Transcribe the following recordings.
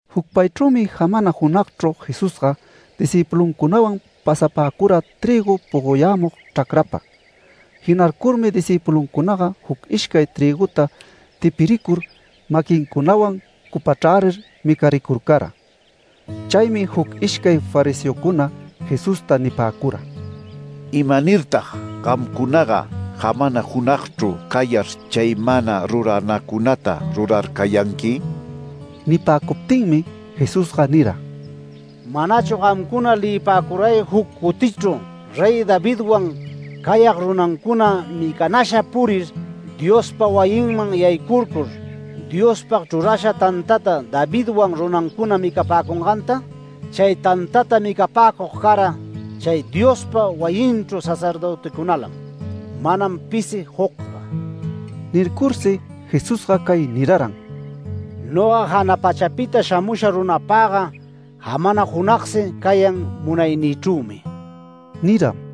Jucpaychrümi jamana junagchru Jesusga discïpuluncunawan pasapäcura trïgu pogoyämug chracrapa. Jinarcurmi discïpuluncunaga juc ishcay trïguta tipiricur, maquincunawan cupachrärir micaricurcara. Chaymi juc ishcay fariseocuna Jesusta nipäcura: “¿Imanirtag gamcunaga jamana junagchru cayar chay mana ruranacunata rurarcayanqui?” Nipäcuptinmi Jesusga nira: “¿Manachu gamcuna leyipäcuray juc cutichru Rey Davidwan cayag runancuna micanasha purir Diospa wayinman yaycurcur, Diospag chrurasha tantata Davidwan runancuna micapäcunganta? Chay tantata micapäcug cara chay Diospa wayinchu sacerdöticunalam, manam pisi jucga”. Nircursi Jesusga cay niraran: “Noga jana pachapita shamusha runapagga jamana junagsi cayan munaynïchrümi” niram.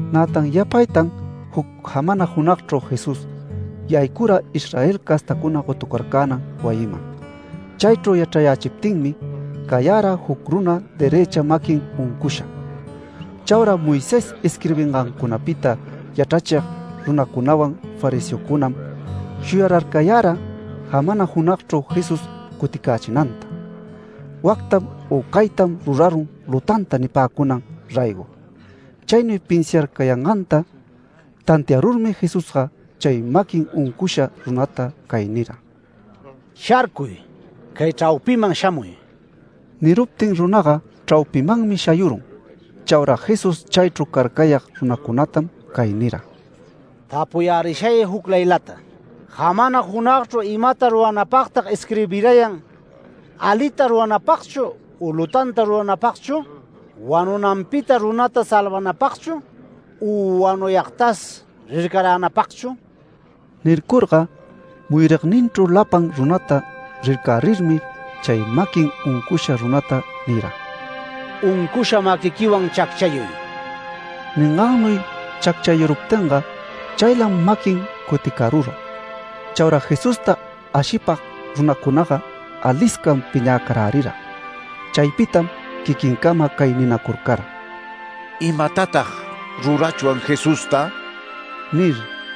Nätan yapaytan juc jamana junagchru Jesús yaycura Israel castacuna gotucarcänan wayiman. Chaychru yachrayächiptinmi cayara juc runa derëcha maquin uncusha. Chaura Moisés isquirbingancunapita yachrachig runacunawan fariseocunam shuyararcayara jamana junagchru Jesús cuticächinanta, wactam u caytam rurarun lutanta nipäcunan raygo. Chaynuy pinsiarcayanganta tantiarurmi Jesusga chay maquin uncusha runata cay nira: “Sharcuy. Cay chraupiman shamuy”. Niruptin runaga chraupimanmi shayurun. Chaura Jesús chaychru carcayag runacunatam cay nira: “Tapuyärishay juclaylata. ¿Jamana junagchru imata ruranapagta isquirbirayan, alita ruranapagchu u lutanta ruranapagchu? ¿Wanunanpita runata salvanapagchu u wanuyagtas rircaränapagchu?” Nircurga muyurigninchru lapan runata rircärirmi, chay maquin uncusha runata nira: “Uncusha maquiquiwan chacchayuy”. Ningannuy chacchayuruptinga chaylam maquin cuticarura. Chaura Jesusta ashipag runacunaga aliscam piñäcarärira. Chaypitam quiquincama cay ninacurcara: “¿Imatatag ruraruchwan Jesusta?” nir.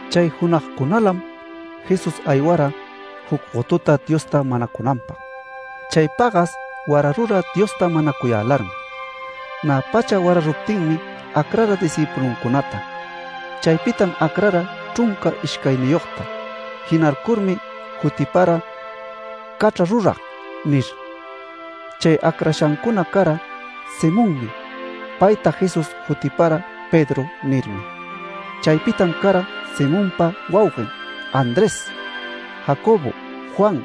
Chay junagcunalam Jesús aywara juc gotuta Diosta manacunanpag. Chay pagas wararura Diosta manacuyälarmi. Nä pacha wararuptinmi acrara discïpuluncunata. Chaypitam acrara chrunca ishcayniyogta, jinarcurmi jutipara ‘Cachra rurag’ nir. Chay acrashancuna cara: Simonmi. Payta Jesús jutipara ‘Pedro’ nirmi. Chaypitam cara Simonpa wauguen Andrés, Jacobo, Juan,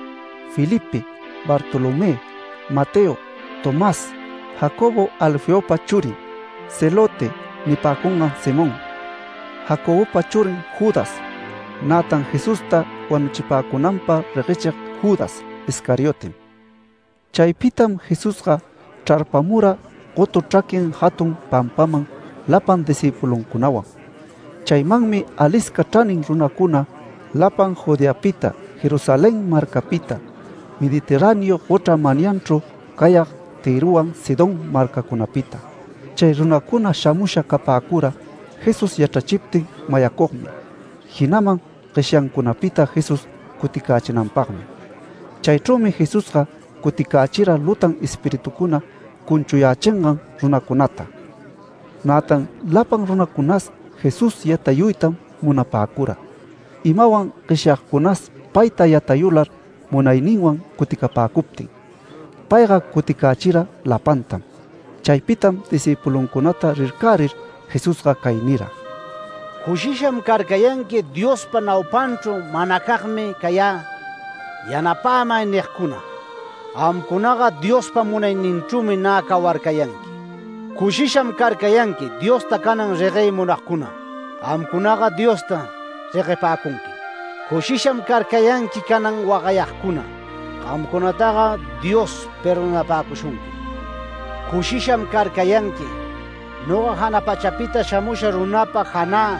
Felipe, Bartolomé, Mateo, Tomás, Jacobo Alfeopa churin, ‘Celote’ nipäcungan Simón, Jacobopa churin Judas, nätan Jesusta wanuchipäcunanpag reguechig Judas Iscariotem. Chaypitam Jesusga chrarpamura gotu chraquin jatun pampaman lapan discïpuluncunawan. Chaymanmi alisca chranin runacuna, lapan Judeapita, Jerusalén marcapita, Mediterráneo gochra manyanchru cayag Tïrowan Sidón marcacunapita. Chay runacuna shamusha capäcura Jesús yachrachiptin mayacugmi, jinaman gueshyancunapita Jesús cuticächinanpagmi. Chaychrümi Jesusga cuticächira lutan espiritucuna cunchuyächingan runacunata. Nätan lapan runacunas Jesús yatayuytam munapäcura, imawan gueshyagcunas payta yatayular munayninwan cuticapäcuptin. Payga cuticächira lapantam. Chaypitam discïpuluncunata rircärir Jesusga cay nira: “Cushisham carcayanqui Diospa naupanchru ‘Manacagmi cayä. Yanapämay’ nigcuna. Gamcunaga Diospa munayninchrümi nä cawarcayanqui. Cushisham carcayanqui Diosta canan reguey munayagcuna. Gamcunaga Diosta reguepäcunquim. Cushisha carcayanqui canan wagayagcuna. Gamcunataga Dios perdonapäcushunquim. Cushisham carcayanqui, noga jana pachapita shamusha runapa janä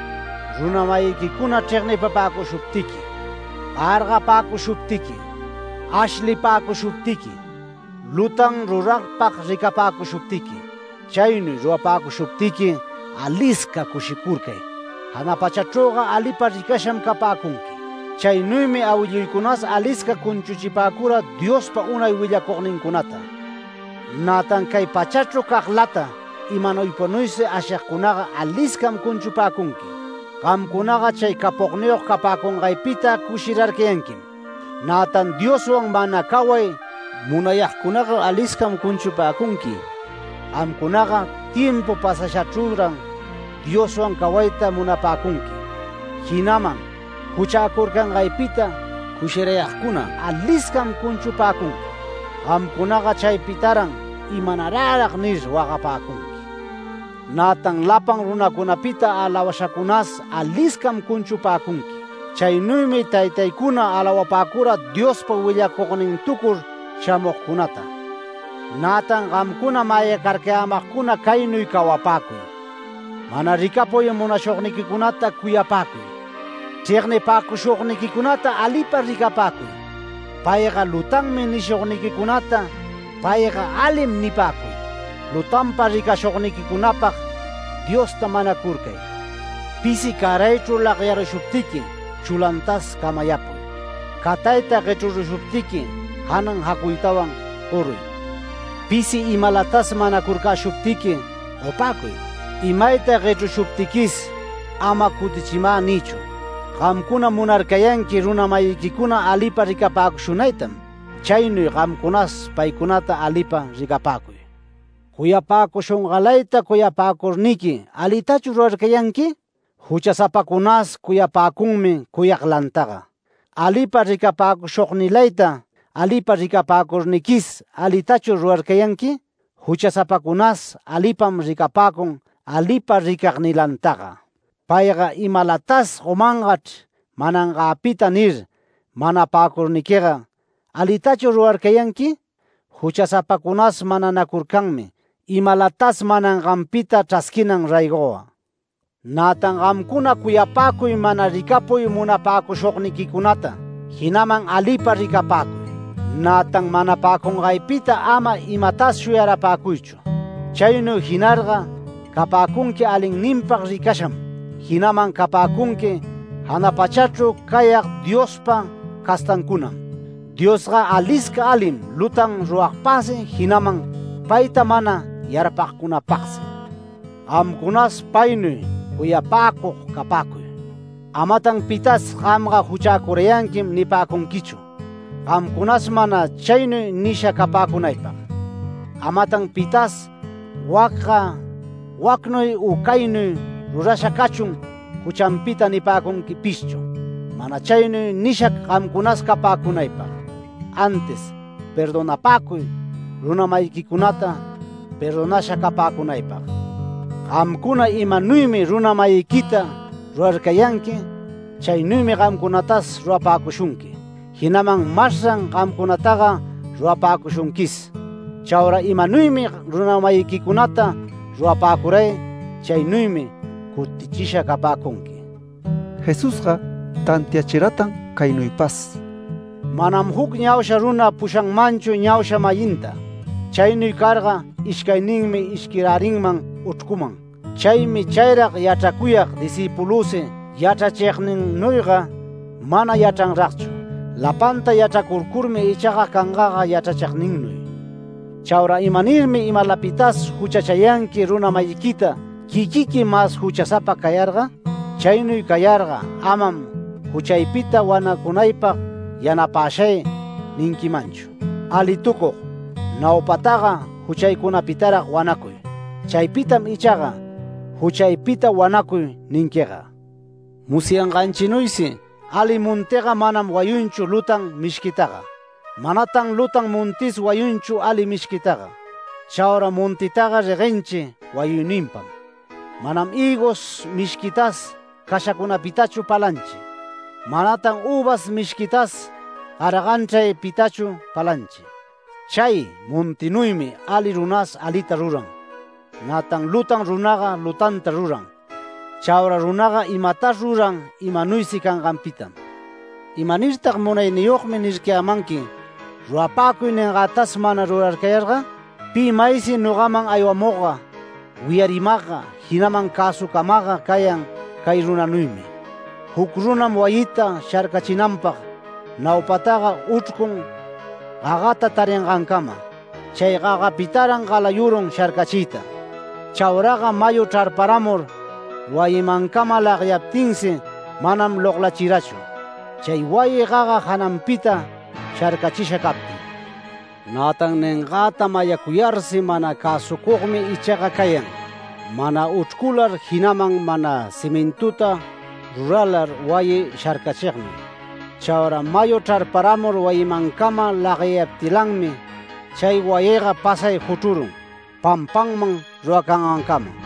runa-mayiquicuna chregnipapäcushuptiqui, gargapäcushuptiqui, ashlipäcushuptiqui, lutan ruragpag ricapäcushuptiqui. Chaynuy rurapäcushuptiqui alisca cushicurcay, jana pachachrüga alipag ricasham capäcunqui. Chaynuymi awilluycunas alisca cunchuchipäcura Diospa unay willacugnincunata. Nätan cay pachachru caglata imanuypanuysi ashigcunaga aliscam cunchupäcunqui. Gamcunaga chay capogniyog capäcungaypita cushirarcayanquim. Nätan Dioswan mana caway munayagcunaga aliscam cunchupäcunqui. Gamcunaga timpu pasashachrüran Dioswan cawayta munapäcunqui. Jinaman juchäcurcangaypita cushirayagcuna aliscam cunchupäcunqui. Gamcunaga chaypitaran ‘¿Imanarärag?’ nir wagapäcunqui. Nätan lapan runacunapita alawashacunas aliscam cunchupäcunqui. Chaynuymi taytaycuna alawapäcura Diospa willacugnintucur shamugcunata”. “Nätan gamcuna mayacarcayämagcuna caynuy cawapäcuy: Mana ricapuy munashugniquicunata cuyapäcuy. Chregnipäcushugniquicunata alipa ricapäcuy. ‘Payga lutanmi’ nishugniquicunata ‘Payga alim’ nipäcuy. Lutanpa ricashugniquicunapag Diosta manacurcay. Pisi cäraychru lagyarushugniqui chulantas camayapuy. Catayta guechrushuptiqui janan jacuytawan goruy. Pisi imalatas manacurcäshuptiqui gopäcuy. Imayta guechrushuptiquis ama ‘Cutichimä’ niychu. Gamcuna munarcayanqui runa-mayiquicuna alipa ricapäcushunaytam, chaynuy gamcunas paycunata alipa ricapäcuy. Cuyapäcushungalayta cuyapäcurniqui ¿alitachur rurarcayanqui? Juchasapacunas cuyapäcunmi cuyaglantaga. Alipa ricapäcushugnilayta alipa ricapäcurniquis ¿alitachur rurarcayanqui? Juchasapacunas alipam ricapäcun alipa ricagnilantaga. ‘Payga imalatas gomangachr manangäpita’ nir manapäcurniquiga ¿alitachur rurarcayanqui? Juchasapacunas mananacurcanmi imalatas mananganpita chrasquinan raygoga. Nätan gamcuna cuyapäcuy mana ricapuy munapäcushugniquicunata jinaman alipa ricapäcuy. Nätan manapäcungaypita ama imatas shuyarapäcuychu. Chaynuy jinarga capäcunqui alinninpag ricasham, jinaman capäcunqui jana pachachru cayag Diospa castancunam. Diosga alisca alim lutan runapagsi, jinaman payta mana yarpagcunapagsi. Gamcunas paynuy cuyapäcug capäcuy”. “Amatan pitas ‘Gamga juchäcurayanquim’ nipäcunquichu. Gamcunas mana chaynuy nisha capäcunaypag. Amatan pitas ‘Wacga wacnuy u caynuy rurasha’ cachun juchanpita nipäcunquipishchu, mana chaynuy nisha gamcunas capäcunaypag. Antis perdonapäcuy runa-mayiquicunata, perdonasha capäcunaypag. Gamcuna imanuymi runa-mayiquita rurarcayanqui, chaynuymi gamcunatas rurapäcushunqui, jinaman masran gamcunataga rurapäcushunquis. Chaura imanuymi runa-mayiquicunata rurapäcuray, chaynuymi cutichisha capäcunqui”. Jesusga tantiachiratan caynuypas: “Manam juc ñausha runa pushapanmanchu ñausha-mayinta. Chaynuy carga ishcayninmi ishquirärinman uchrcuman. Chaymi chayrag yachracuyag discïpulüsi yachrachigninnuyga mana yachranragchu. Lapanta yachracururmi ichaga cangaga yachrachigninnuy. Chaura ¿imanirmi imalapitas juchachayanqui runa-mayiquita, quiquiqui mas juchasapa cayarga? Chaynuy cayarga amam ‘Juchaypita wanacunaypag yanapäshay’ ninquimanchu. ¡Alitucug! Naupataga juchaycunapitarag wanacuy. Chaypitam ichaga “Juchaypita wanacuy” ninquiga. Musyanganchinuysi ali montiga manam wayunchu lutan mishquitaga. Manatan lutan montis wayunchu ali mishquitaga. Chaura montitaga reguenchi wayuyninpam. Manam hïgos mishquita cashacunapitachu palanchi. Manatan üvas mishquitas garajanchraypitachu palanchi. Chay montinuymi ali runas alita ruran. Nätan lutan runaga lutanta ruran. Chaura runaga imatas ruran imanuysi canganpitam. “¿Imanirtag ‘Munayniyogmi’ nircayämanqui, rurapäcuy niyangätas mana rurarcayarga? Pi maysi nogaman aywamugga, wiyarimagga, jinaman cäsucamagga cayan cay runanuymi; Juc runam wayita sharcachinanpag naupataga uchrcun gagata taringancama. Chay gagapitaran galayurun sharcachiyta. Chauraga mayu chrarparamur wayimancama lagyaptinsi manam loglachirachu chay wayi gaga jananpita sharcachisha captin. Nätan ningäta mayacuyarsi mana cäsucugmi ichaga cayan, mana uchrcular, jinaman mana cimintuta ruralar wayi sharcachignuy. Chaura mayu chrarparamur wayimancama lagyayaptilanmi chay wayiga pasay juchrurun, pampanman ruracangancama”.